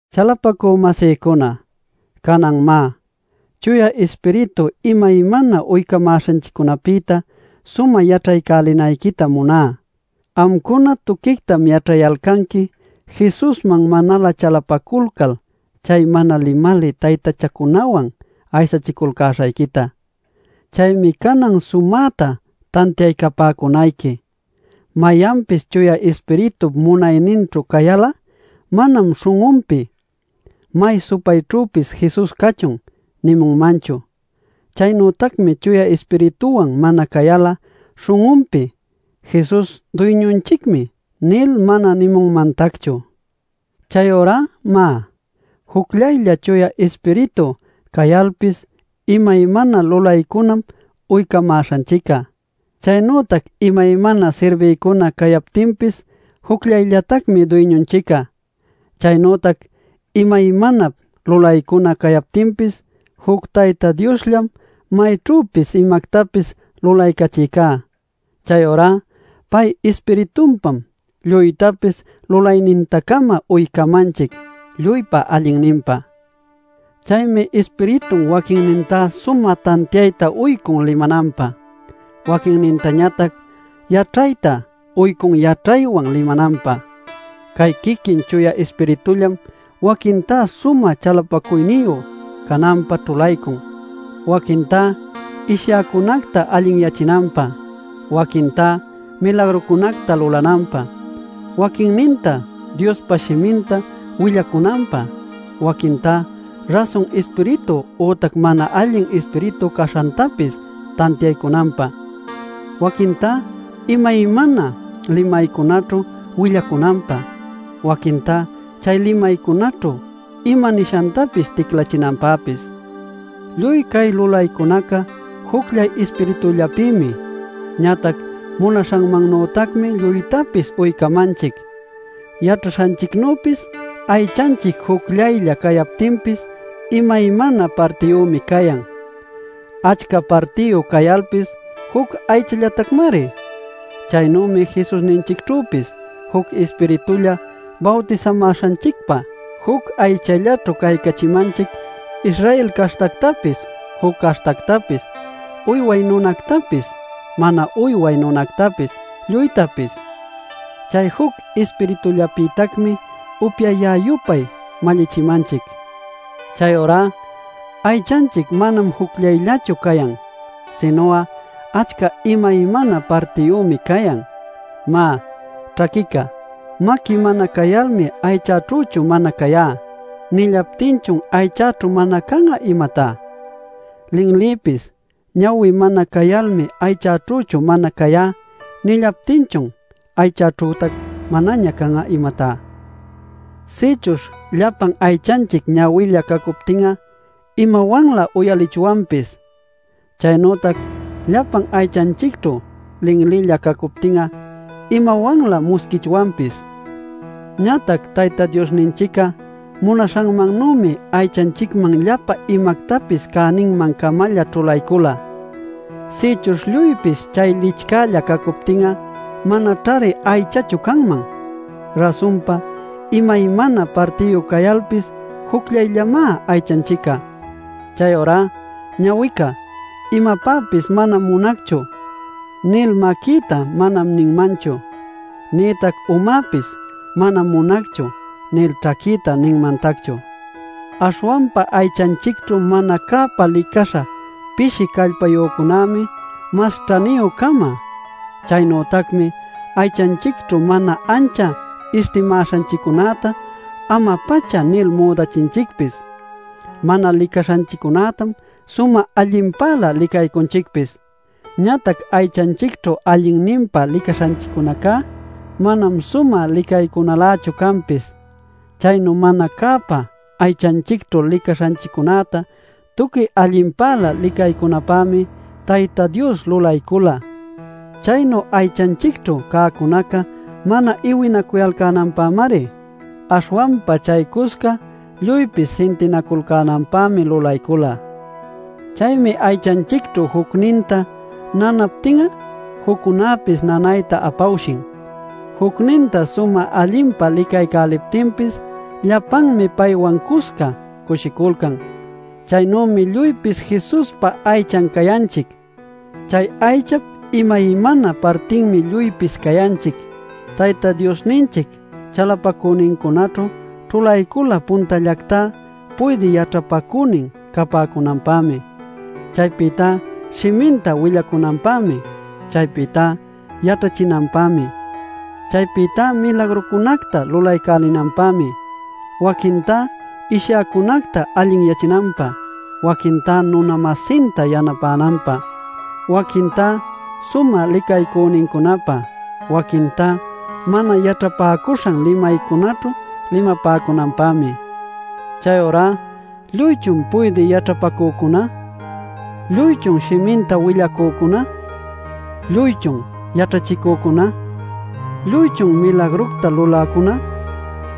Chalapacü-masïcuna, canan má, Chuya Ispiritu imaymana uycamäśhanchiccunapïta sumä yaćhaycälinayquitam muná. Amcuna tuquictam yaćhayalcanqui Jesusman manalä chalapaculcal chay mana limalï taytachacunawan aysachiculcäśhayquita. Chaymi canan sumäta tantiaycapäcunayqui: mayanpis Chuya Ispiritup munayninćhu cayal'a manam śhun'unpi “¡May supayćhüpis Jesus cachun!” nimunmanchu. Chaynütacmi Chuya Ispirituwan mana cayal'a śhun'unpi “Jesus Duyñunchicmi” nil mana nimunmantacchu. Chayurá má, jucllaylla Chuya Ispiritu cayalpis imaymana lulaycunam uycamäśhanchic'a. Chaynütac imaymana sirbiycuna cayaptinpis jucllayllatacmi Duyñunchic'a. Chaynütac imaymanap lulaycuna cayaptinpis, juc Tayta Diosllam mayćhüpis imactapis lulaycachïcá. Chayurá pay Ispiritunpam lluytapis lulayninta-cama uycamanchic lluypa allinninpä. Chaymi Ispiritun waquinninta sumä tantiayta uycun limananpä, waquintañatac yaćhayta uycun yaćhaywan limananpä. Cay quiquin Chuya Ispiritullam waquintá sumä chalapacuyniyu cananpä ćhulaycun, waquintá ishyäcunacta allinyachinanpä; waquintá milagrucunacta lulananpä; waquinnintá Diospa shiminta willacunanpä; waquintá rasun Ispiritu ütac mana allin ispiritu caśhantapis tantiaycunanpä; waquintá imaymana limaycunaćhu willacunanpä; waquintá chay limaycunaćhu ima nishanta ticlachinanpäpis. Lluy cay lulaycunaca jucllay Ispiritullapïmi, ñatac munaśhanmannütacmi lluytapis uycamanchic. Yaćhaśhanchicnüpis aychanchic jucllaylla cayaptinpis imaymana partiyümi cayan; achca partiyu cayalpis juc aychallatacmari. Chaynümi Jesusninchicćhüpis. Juc Ispiritulla bawtisamäśhanchicpa juc aychallaćhu caycachimanchic Israel caśhtactapis, juc caśhtactapis, uyway nunactapis, mana uyway nunactapis, lluytapis. Chay juc Ispiritullapïtacmi upyayä-yupay mallichimanchic. Chayurá aychanchic manam jucllayllachu cayan, sinu'a achca imaymana partiyümi cayan. Má, ćhaquica: “Maqui mana cayalmi aychaćhüchu mana cayá” nillaptinchun aychaćhu mana can'a, ¿imatá? Linlipis “Ñawi mana cayalmi aychaćhüchu mana cayá” nillaptinchun aychaćhütac manaña can'a, ¿imatá? Sïchuśh llapan aychanchic ñawilla cacuptin'a ¿imawanlä uyalichwanpis? Chaynütac llapan aychanchicćhu linlilla cacuptin'a ¿imawanlä musquichwanpis? Ñatac Tayta Diosninchic'a munaśhanmannuymi aychanchicman llapa imactapis cäninman-camalla ćhulaycula. Sïchuśh lluypis chay licchälla cacuptin'a manaćhari aychachu canman. Rasunpa imaymana partiyu cayalpis jucllayllamá aychanchic'a. Chayurá ñawica: “Imapäpis manam munacchu” nil maquïta manam ninmanchu. Nïtac umäpis “Manam munacchu” nil ćhaquïta ninmantacchu. Aśhwanpa aychanchicćhu mana cäpa licaśha pishi callpayücunämi mas ćhaniyü-cama. Chaynütacmi aychanchicćhu mana ancha istimaśhanchiccunäta ama-pacha nil müdaycachinchicpis. Mana licaśhanchiccunätam sumä allinpälä licaycunchicpis. Ñatac aychanchicćhu allinninpa licaśhanchiccunacá manam sumä licaycunalächu canpis. Chaynu mana cäpa aychanchicćhu licaśhanchiccunäta tuqui allinpälä licaycunapämi Tayta Dios lulaycula. Chaynu aychanchicćhu cäcunaca mana iwinacuyalcänanpämari, aśhwanpa chaycusca lluypis sintinaculcänanpämi lulaycula. Chaymi aychanchicćhu jucninta nanaptin'a juccunäpis nanayta apawshin. Jucninta sumä allinpa licaycäliptinpis llapanmi paywan cusca cushiculcan. Chaynümi lluypis Jesuspa aychan cayanchic. Chay aychap imaymana partinmi lluypis cayanchic. Tayta Diosninchic chalapacünincunaćhu ćhulaycula puntallactá puydï yaćhapacünin capäcunanpämi. Chaypïtá shiminta willacunanpämi. Chaypïtá yaćhachinanpämi. Chaypïtá milagrucunacta lulaycälinanpämi. Waquintá ishyäcunacta allinyachinanpä, waquintá nuna-masinta yanapänanpä, waquintá sumä licaycünincunapä, waquintá mana yaćhapäcuśhan limaycunaćhu limapäcunanpämi. Chayurá ¿lluychun puydï yaćhapacücuna? ¿Lluychun shiminta willacücuna? ¿Lluychun yaćhachicücuna? ¿Lluychun milagructa luläcuna?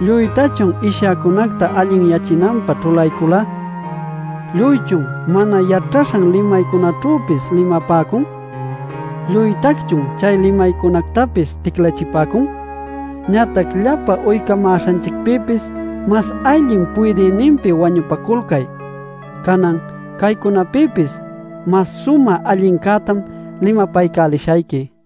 ¿Lluytachun ishyäcunacta allinyachinanpä ćhulaycula? ¿Lluychun mana yaćhaśhan limaycunaćhüpis limapäcun? ¿Lluytacchun chay limaycunactapis ticlachipäcun? Ñatac llapa uycamäśhanchicpïpis mas allin puydïninpi wañupaculcay. Canan caycunapïpis mas sumä allincätam limapaycälishayqui.